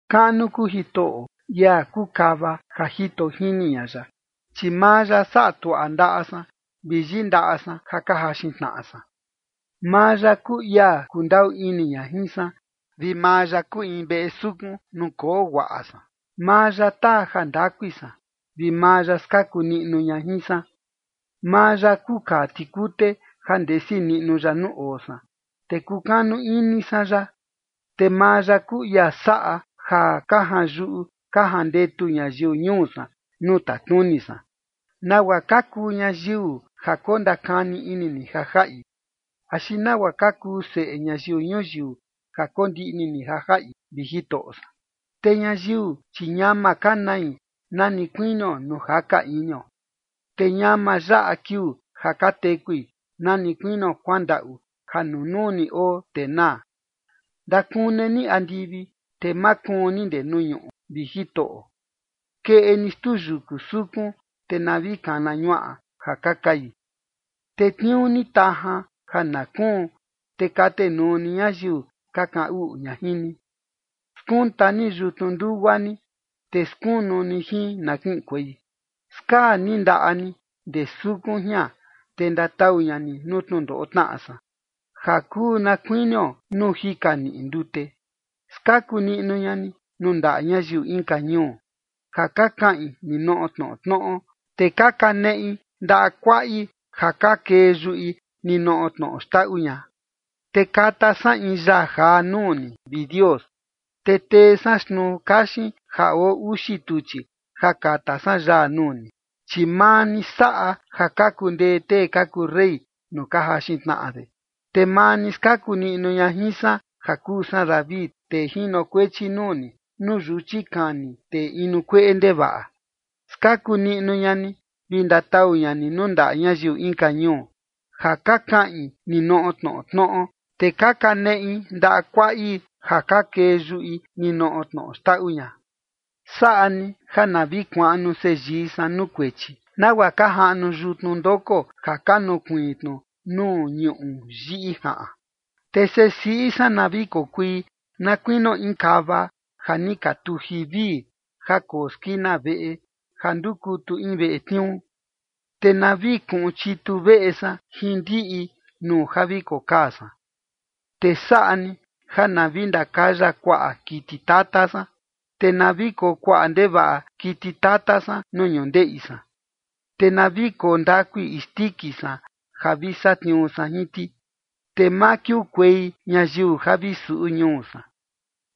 Kaꞌnu kuu Jitoꞌo, ia kuu kava ja jito jini ña ya, chi maa ya saꞌa tuaꞌa ndaꞌa san vi yindaꞌa san ja ka jaxin tnaꞌa san. Maa ya kuu ia kundaꞌu ini ña jin san, vi maa ya kuu in veꞌe sukun nuu koo guaꞌa san. Maa ya taa ja ndakui san, vi maa ya skaku niꞌnu ña jin san. Maa ya kuu kaa tikute ja ndesi niꞌnu ya nuu oo san, te kukanu ini san ya. Te maa ya kuu ia saꞌa ja ka janyuꞌu ka jandetu ñayiu ñuu san nuu tatnuni san. ¿Nagua ka kuu ñayiu ja kondakani ini ni ja jaꞌi? Axi ¿nagua ka kuu seꞌe ñayiu ñuyiu ja kondiꞌni ni ja jaꞌi, vi Jitoꞌo san? Te ñayiu, chi ñama ka nai na ni kuinio nuu jaka inio, te ñama yaꞌa kiuu ja ka tekui na ni kuinio kuandaꞌu ja nunuu ni oo, te naa. Ndakune ni andivi, te makuun ni ndee nuu ñuꞌu, vi Jitoꞌo. Keꞌe ni xtuu yuku sukun, te na vi kana ñuaꞌa ja ka kai. Tetniuu ni tajan ja na kuun, te katenuu ni ñayiu ka kaꞌan uꞌu ña jin ni. Skunta ni yutnu ndugua ni, te skunu ni jin na kiꞌinkuei. Skaa ni ndaꞌa ni ndee sukun jian, te ndatau ña ni nuu tnundoꞌo tnaꞌa san, ja kuu na kuinio nuu jika niꞌi ndute. Skaku niꞌnu ña ni nuu ndaꞌa ñayiu inka ñuu, ja ka kaꞌin ninoꞌo tnoꞌo tnoꞌo, te ka kaneꞌi ndaꞌa kuaꞌi ja ka kee yuꞌi ninoꞌo tnoꞌo xndaꞌu ña. Te kata san in yaa jaa nuu ni, vi Dios, te tee san xtnuu kaxin ja oo uxi tuchi ja kata san yaa nuu ni. Chi maa ni saꞌa ja ka kundee tee ka kuu rey nuu ja jaxin tnaꞌa de. Te maa ni skaku ña jin san ja kuu san David, tee jinokuechi nuu ni, nuu yuchi kani tee inu kueꞌe ndevaꞌa. Skaku niꞌnu ña ni, vi ndatau ña ni nuu ndaꞌa ñayiu inka ñuu, ja ka kaꞌin ninoꞌo tnoꞌo tnoꞌo, te ka kaneꞌi ndaꞌa kuaꞌi ja ka kee yuꞌi ninoꞌo tnoꞌo xndaꞌu ña. Saꞌa ni ja na vi kuaꞌnu seyii san nuu kuechi, nagua ka jaꞌnu yutnu ndoko ja ka nukuiin tnu nuu ñuꞌu yiꞌi jaꞌan. Te sesiꞌi san na vi kokui na kuinio in kava ja ni ka tuji vii, ja koo skina veꞌe ja ndukutu in veꞌe tniuu. Te na vi kuꞌun chitu veꞌe san jin ndiꞌi nuu ja vi kokaa san. Te saꞌa ni ja na vi ndakaya kuaꞌa kiti tata san, te na vi koo kuaꞌa ndevaꞌa kiti tata san nuu ñundeꞌi san. Te na vi koo ndakui isndiki san ja vi satniuu san jin ti. Te ma kiukuei ñayiu ja vi suꞌu ñuu san,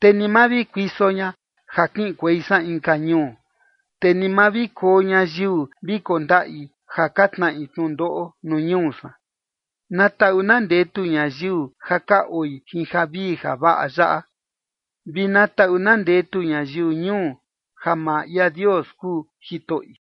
te ni ma vi kuiso ña ja kiꞌinkuei san inka ñuu, te ni ma vi koo ñayiu vi kondaꞌi ja ka tnaꞌi tnundoꞌo nuu ñuu san. Na taꞌu na ndetu ñayiu ja ka oi jin javii javaꞌa yaꞌa, vi na taꞌu na ndetu ñayiu ñuu ja maa ia Dios kuu Jitoꞌi.